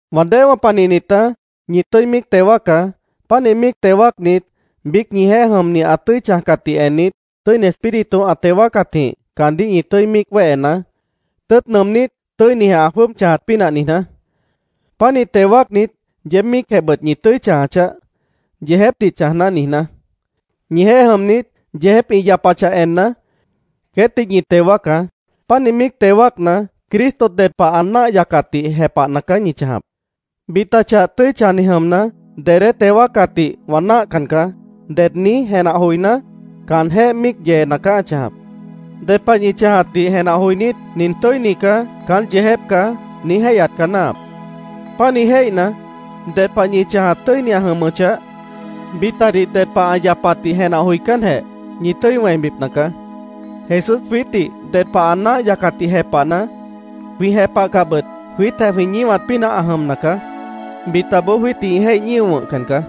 Wã déewã panihnitá, ñi tʉ́i míic teo wáacá. Pánih míic teo wáacnit, biíc ñijeéh jʉmni ã tʉ́i chãjcatdih ennit, Tʉ́ini Espíritu ã teo wáacatjĩh caandíh ñi tʉ́i míic wéhenaá, tʉ́ʉt nʉʉmnít, tʉ́inijeh ã jwʉ́ʉb chãjat pínah niijná. Pánih teo wáacnit, yeéb míicjehbʉt ñi tʉ́i chãja chaáh, “Yeejépdih chãjná”, niijná. Ñijeéh jʉmnit yeejép ĩ yapachah enna, queétdih ñi teo wáacá. Pánih míic teo wáacna, Cristo ded pah ã náah yacatdih jepahna caá ñi chãjap. “Bita chah tʉ́i chãjni jʉmna, dedé teo wáacatdih wã náahcan caá”, ded niíj jenah joiná, caanjéh míic yeena caá ã chãjap. Ded pah ñi chãjatdih jenah joinít, “Nin tʉ́ini caá. Caán yeejép caá”, niíj jéihyat caá náahap. Pánih jéihna, ded pah ñi chãjat tʉ́ini ã jʉmʉchah, bitadih ded pah ã yapatdih jenah joicánjeh, ñi tʉ́i wẽibipna caá. Jesús jwiítdih ded pah ã náah yacatdih jepahna, jwĩ jepahcahbʉt jwiítjeh jwĩ ñíwat pínah ã jʉmna caá. Bitaboó jwiítdih ĩ jéih ñío wʉ̃hcan caá.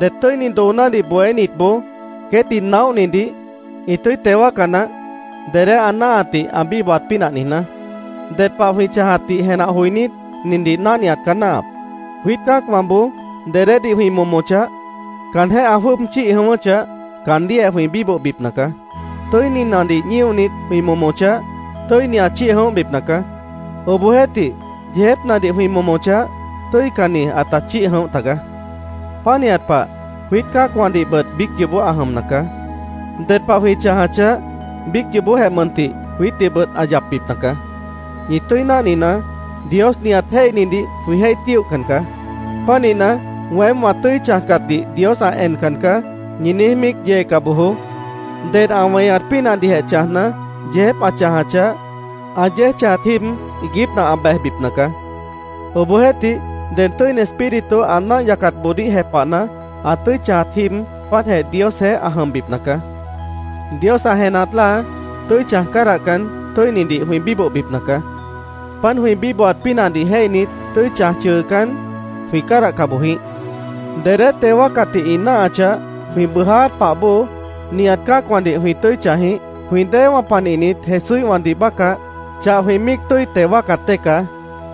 Det tʉ́ini doonádih bohénitboó queétdih naóhnidih ĩ tʉ́i teo wáaca naáh, dedé ã náahatdih ã bíbohat pínah niijná. Ded pah jwĩ chãjatdih jenah joinít, nindih náhniat caá náahap: Jwiít cã́acwãboó dedédih jwĩ momochah, caanjéh ã jwʉ́ʉb chíih jʉ̃ʉ́wʉ́chah, caandíhjeh jwĩ bíbohbipna caá. Tʉ́ininadih ñíonit, jwĩ momochah, tʉ́ini ã chíih jʉ̃óhbipna caá. Obohjeéhtih, yeejépnadih jwĩ momochah, tʉ́icanni ãta chíih jʉ̃óh tagaá. Pánihat pah, jwiít cã́acwãdihbʉt biíc yoobó ã jʉmna caá. Ded pah jwĩ chãjachah, biíc yoobójeh mʉntih jwiítdihbʉt ã yapbipna caá. Ñi tʉ́i náhninaá, Dios nihat jéihnidih jwĩ jéih tíohcan caá. Pánihna, “Weém wã tʉ́i chãjcatdih Dios ã encan caá”, ñi niíj míic yeeca bojoó. Ded ã weñat pínahdihjeh chãjna, yeejép ã chãjachah, ã yéej chãjat jíib, iiguípna ã bejbipna caá. Obohjeéhtih, ded Tʉ́ini Espíritu ã náah yacatboodíh jepahna, ã tʉ́i chãjat jíib, páantjeh Diosjeéh ã jʉmbipna caá. Dios ã jenahat láa, tʉ́i chãj cádahcan, tʉ́inidih jwĩ bíbohbipna caá. Páant jwĩ bíbohat pínahdih jéihnit, tʉ́i chãj chʉʉcán, jwĩ cádahca boj jĩíh. Dedé teo wáacatdih ĩ náahachah, jwĩ bʉʉjáát pah bóo, nihat cã́acwãdih jwĩ tʉ́i chãj jĩíh. Jwĩ déewã panihnit Jesúíhwãdih bácah, chah jwĩ míic tʉ́i teo wáacat dée caá.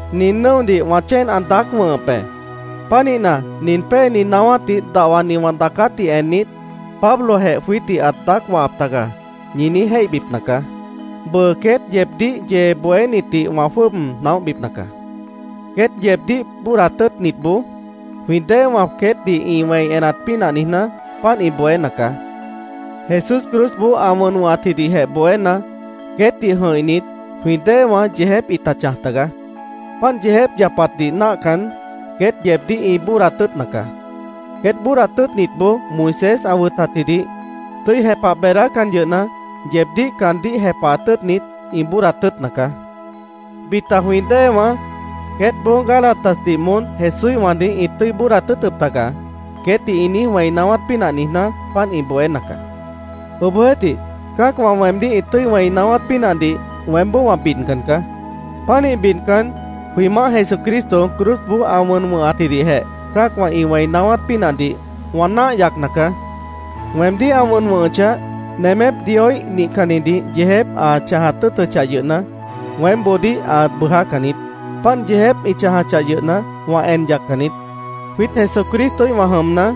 Nin nʉ́odih wã chéen ã daác wʉ̃hʉp be. Pánihna, nin péeni naáwátdih dahwani wã daacátdih ennit, “Pablojeh jwiítdih ãt daác wahap taga”, ñi niíj jéihbipna caá. Bʉʉ queét yeebdíh yee bohénitdih wã jwʉ́ʉb naóhbipna caá. Queét yeebdíh bóodat tʉ́ʉtnitboó jwĩ déewã queétdih ĩ wẽi enat pínah niijná, páant ĩ bohéna caá. Jesús cruzboó ã wʉn wʉ̃hatjidihjeh bohéna, queétdih jʉ̃ihnit, jwĩ déewã yeejép ĩta chãj tagaá. Páant yeejép yapatdih náahcan, queét yeebdíh ĩ bóodat tʉ́ʉtna caá. Queét bóodat tʉ́ʉtnitboó Moisés ã wʉtatjidih tʉ́i jepah beedácan yʉhna, yeebdíh caandíh jepahat tʉ́ʉtnit, ĩ bóodat tʉ́ʉtna caá. Bita jwĩ déewã “Queétboó Gálatasdih moón Jesúíhwãdih ĩt tʉ́i bóodat tʉ́ʉtʉp tagaá”, queétdih ĩ niíj wẽi naáwát pínah niijná, páant ĩ bohéna caá. Obohjeéhtih, cã́acwã weemdíh ĩ tʉ́i wẽi naáwát pínahdih weémboó wã bidcan caá. Pánih bidcan, jwĩ Maáh Jesucristo cruzboó ã wʉn wʉ̃hatjidihjeh cã́acwã ĩ wẽi naáwát pínahdih wã náah yacna caá. Weemdíh ã wʉn wʉ̃hʉchah, nemép Dioíh nihcannitdih yeejép ã chãjat tʉ́ʉtʉchah yʉhna, weémboodíh ã bʉʉjácan niít. Páant yeejép ĩ chãjachah yʉhna, wã en yaccan niít. Jwiít Jesucristoíhwã jʉmna,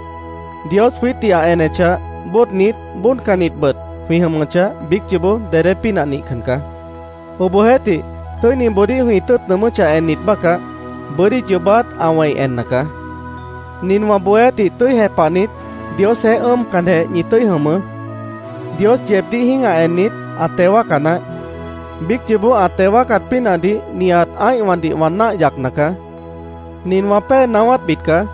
Dios jwiítdih ã enechah, bóodnit, bóodcannitbʉt jwĩ jʉmʉchah, biíc yoobó dedé pínah nihcan caá. Obohjeéhtih, tʉ́iniboodíh jwĩ tʉ́ʉt nʉʉmʉ́chah ennit bácah, bʉ́dí yoobát ã wẽi enna caá. Nin wã bohéátdih tʉ́i jepahnit, Diosjeéh ʉ́ʉmcanjeh ñi tʉ́i jʉmʉʉ́. Dios yeebdíh jĩ́gah ennit, ã teo wáaca naáh. Biíc yoobó ã teo wáacat pínahdih nihat ã́ihwãdih wã náah yacna caá. Nin wã pée naáwátbit caá: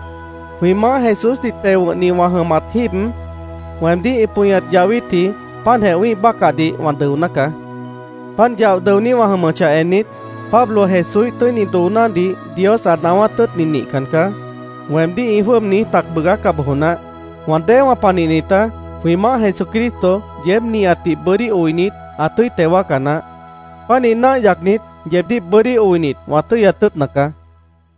Jwĩ Maáh Jesúsdih teo wʉ̃hni wã jʉmat jíib, weemdíh ĩ pʉñat yahwítji páantjeh wĩ́ih bácahdih wã dʉoná caá. Páant yaoh dʉoní wã jʉmʉchah ennit, “Pablo Jesúíh tʉ́ini doonádih Dios ã naáwát tʉ́ʉtni nihcan caá”, weemdíh ĩ jwʉ́ʉb niíj tac bʉʉgáca bojo naáh. Wã déewã panihnitá, jwĩ Maáh Jesucristo yeéb nihatdih bʉ́dí oinit, ã tʉ́i teo wáaca naáh. Pánih náah yacnit, yeebdíh bʉ́dí oinit, wã tʉ́yat tʉ́ʉtna caá.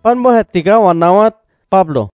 Páant bóojeh tigaá wã daacát. Pablo